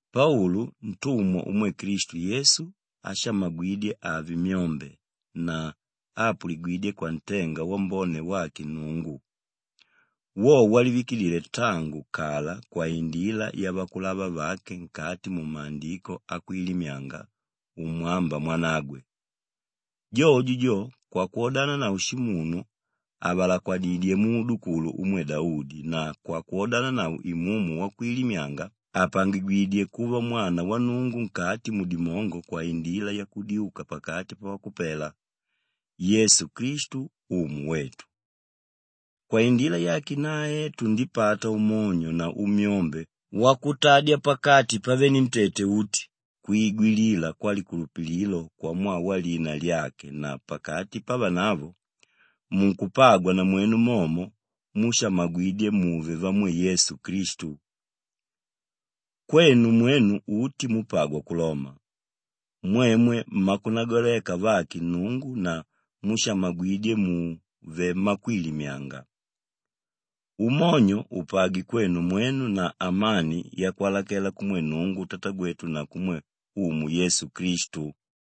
Paulu, ntumwa umwe Klistu Yesu áshamagwidye ave myombe na áapuligwidye kwantenga wambone wake Nnungu, wo walivikidile tangu kala kwaindila yavakulava vake nkati mumaandiko akwilimyanga umwámba mwanagwe, jojo jo, kwakwodananavo shimunu ávalakwadidye muudukulu umwe Daudi na kwakwodananavo Imumu waukwilimyanga ápangigwidye kuva Mwana wa Nnungu nkati mudimongo kwaindila yakudyuka pakati pavakupela, Yesu Klistu Umu wetu. Kwaindila yake nae tundipata umonyo na umyombe wakutadya pakati pavenentete uti kwigwilila kwalikulupililo kwamwaa walina lyake na pakati pavanavo, munkupagwa namwenu momo múshamagwidye muve vamwe Yesu Klistu. Kwenu mwenu uti múpagwa ku Loma, mwemwe mmakunagwaleka vake Nnungu na múshamagwidye muve mmakwilimyanga. Umonyo upagwe kwenu mwenu na amani yakwalakela kumwe Nnungu Tatagwetu na kumwe Umu Yesu Klistu.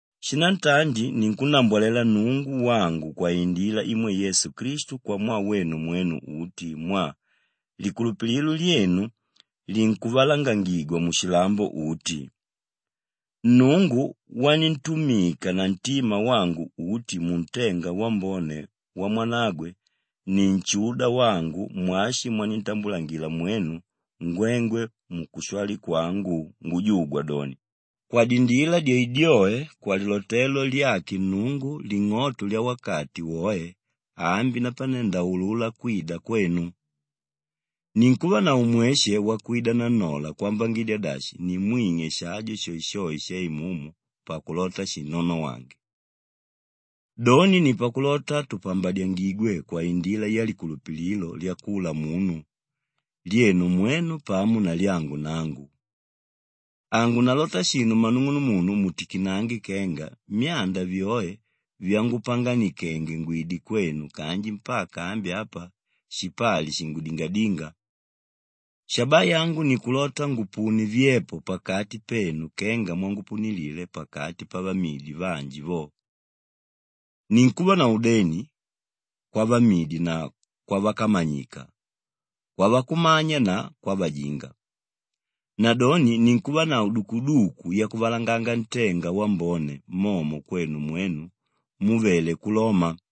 Shinantandi ninkunnambwalela Nnungu wangu kwaindila imwe Yesu Klistu kwamwaa wenu mwenu uti mwaa likulupililo lyenu linkuvalangangigwa mushilambo uti. Nnungu wanintumika na ntima wangu uti muntenga wambone wa Mwanagwe ni nshuda wangu mwashi mwanintambulangila mwenu ngwengwe mukushwali kwangu ngujugwa doni, kwadindila dyoedyoe kwalilotelo lyake Nnungu ling'oto lyawakati woe ambi napane ndaulula kwida kwenu. Ninkuvanavo mweshe wakwida nannola kwambangidya dashi nimwing'e shajo shoeshoe shaimumu pakulota shinnonowange. Doni ni pakulota tupambadyangigwe kwaindila yalikulupililo lyakula munu, lyenu mwenu pamo na lyangu nangu. Hangunalota shinu mmanung'unumunu mutikinange kenga myanda vyoe vyangupanganikenge ngwide kwenu kanji mpaka ambi apa shipali shingudingadínga. Shabaa yangu nikulota ngupune vyepo pakati penu kenga mwangupunilile pakati pavamidi vanji vo. Ninkuvanavo udeni kwavamidi na kwavakamanyika, kwavakumanya na kwavajinga. Nadoni ninkuvanavo dukuduku yakuvalanganga ntenga wambone momo kwenu mwenu múvele ku Loma.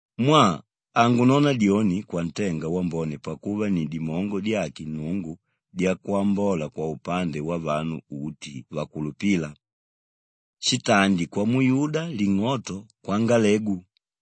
Mwaa hangunona dyoni kwantenga wambone pakuva ni dimongo dyake Nnungu dyakwambola kwaupande wavanu uti vakulupíla; shitandi kwamuyuda ling'oto kwangalegu.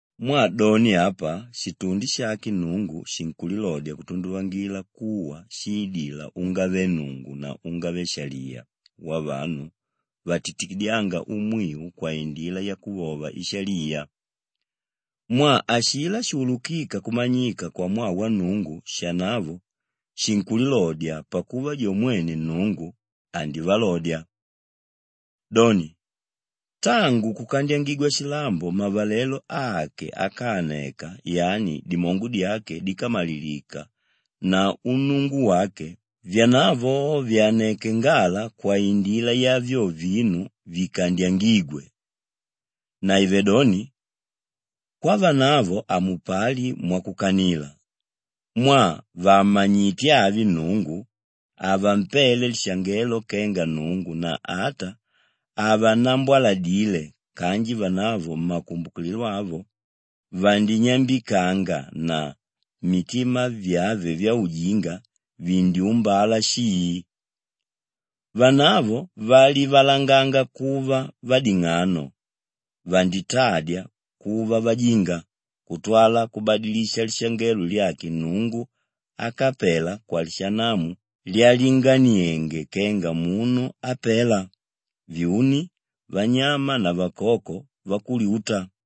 Mwaa doni apa, shitundi shake Nnungu shinkulilodya kutunduvangila kuwa shiidila ungave-Nnungu na ungave-shaliya wavanu vatitikidyánga umwiu kwaindila yakuvova ishaliya. Mwaa ashilá shuulukíka kumanyika kwamwaa wa Nnungu shanavo shinkulilodya pakuva jo mwene Nnungu, andivalodya. Doni, tangu kukandyangigwa shilambo mavalelo ake ákaaneka yani dimongo dyake díkamalilika na unnungu wake, vyanavo vyaneke ngala kwaindila ya vyo vinu vikandyangígwe. Naivedoni, kwavanavo hamupali mwakukanila. Mwaa vàmmanyite avi Nnungu, havampele lishangelo kenga Nnungu na ata havannambwaladile kanji vanavo mmakumbukililo ave vandinyambikanga na mitima vyave vyaujinga vindyumbala shii. Vanavo valivalanganga kuva vading'ano vanditadya kuva vajinga kutwala kubadilisha lishangelo lyake Nnungu ákapela kwalishinamu lyalinganienge kenga munu ápela, vyuni, vanyama na vakoko vakulyuta.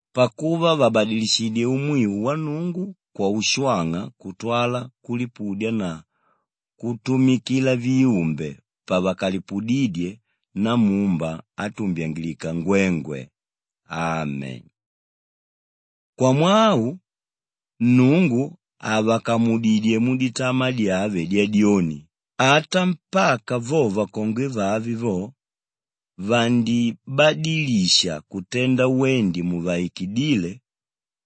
pakuva vabadilishidyé umwiu wa Nnungu kwaushwang'a kutwala kulipudya na kutumikila viumbe pavakalipudídye Namumba átumbyangilika ngwengwe. Ame. Kwamwaa au, Nnungu avakamudidyé muditamaa dyave dyadyoni, ata mpaka vo vakongwe vave vo, vandibadilisha kutenda wendi muvaikidíle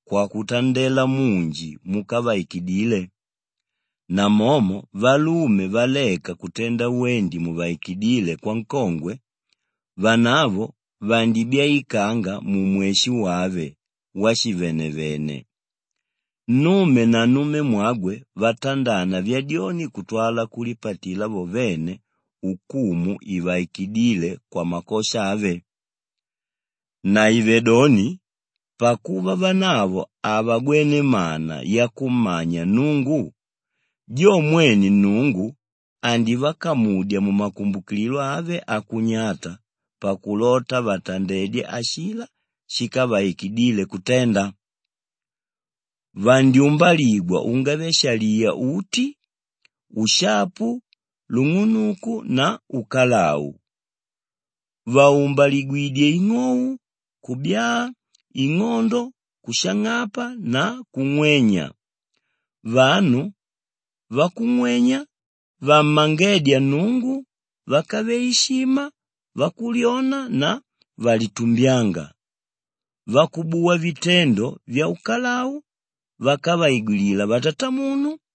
kwakutandela munji múkavaikidile. Namomo valume valeka kutenda wendi muvaikidíle kwankongwe, vanavo vandibyaikanga mumweshe wave washivanavene; nnume na nnumemwagwe vatandana vyadyoni kutwala kulipatila vo vene ukumu ivaikidíle kwamakosha ave. Naivedoni pakuva vanavo havagwene mana yakummanya Nnungu, jo mwene Nnungu andivakamudya mumakumbukililo ave akunyata pakulota vatandedye ashilá shíkavaikidile kutenda. Vandyumbaligwa ungave-shaliya uti; ushapu, lung'unuku na ukalau. Vaumbaligwidyé ing'ou, kubyaa, ing'ondo, kushang'apa na kung'wenya; vanu vakung'wenya, vammangédya Nnungu, vákave ishima, vakulyona na vakulitumbyanga; vakubuwa vitendo vyaukalau, vákavaigwilila vatatamunu,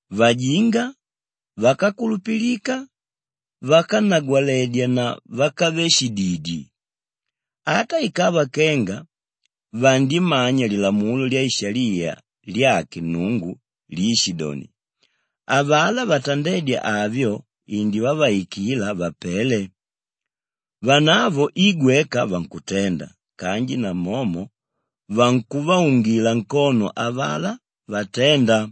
vajinga, vákakulupilika, vákanagwaledya na vákave shididi. Ata ikava kenga vandimanya lilamulo lyaishaliya lyake Nnungu líishidoni, avalá vatandédya avyo indivavaikila vapele. Vanavo i gweka vankutenda kanji namomo vankuvaungila nkono avalá vaténda.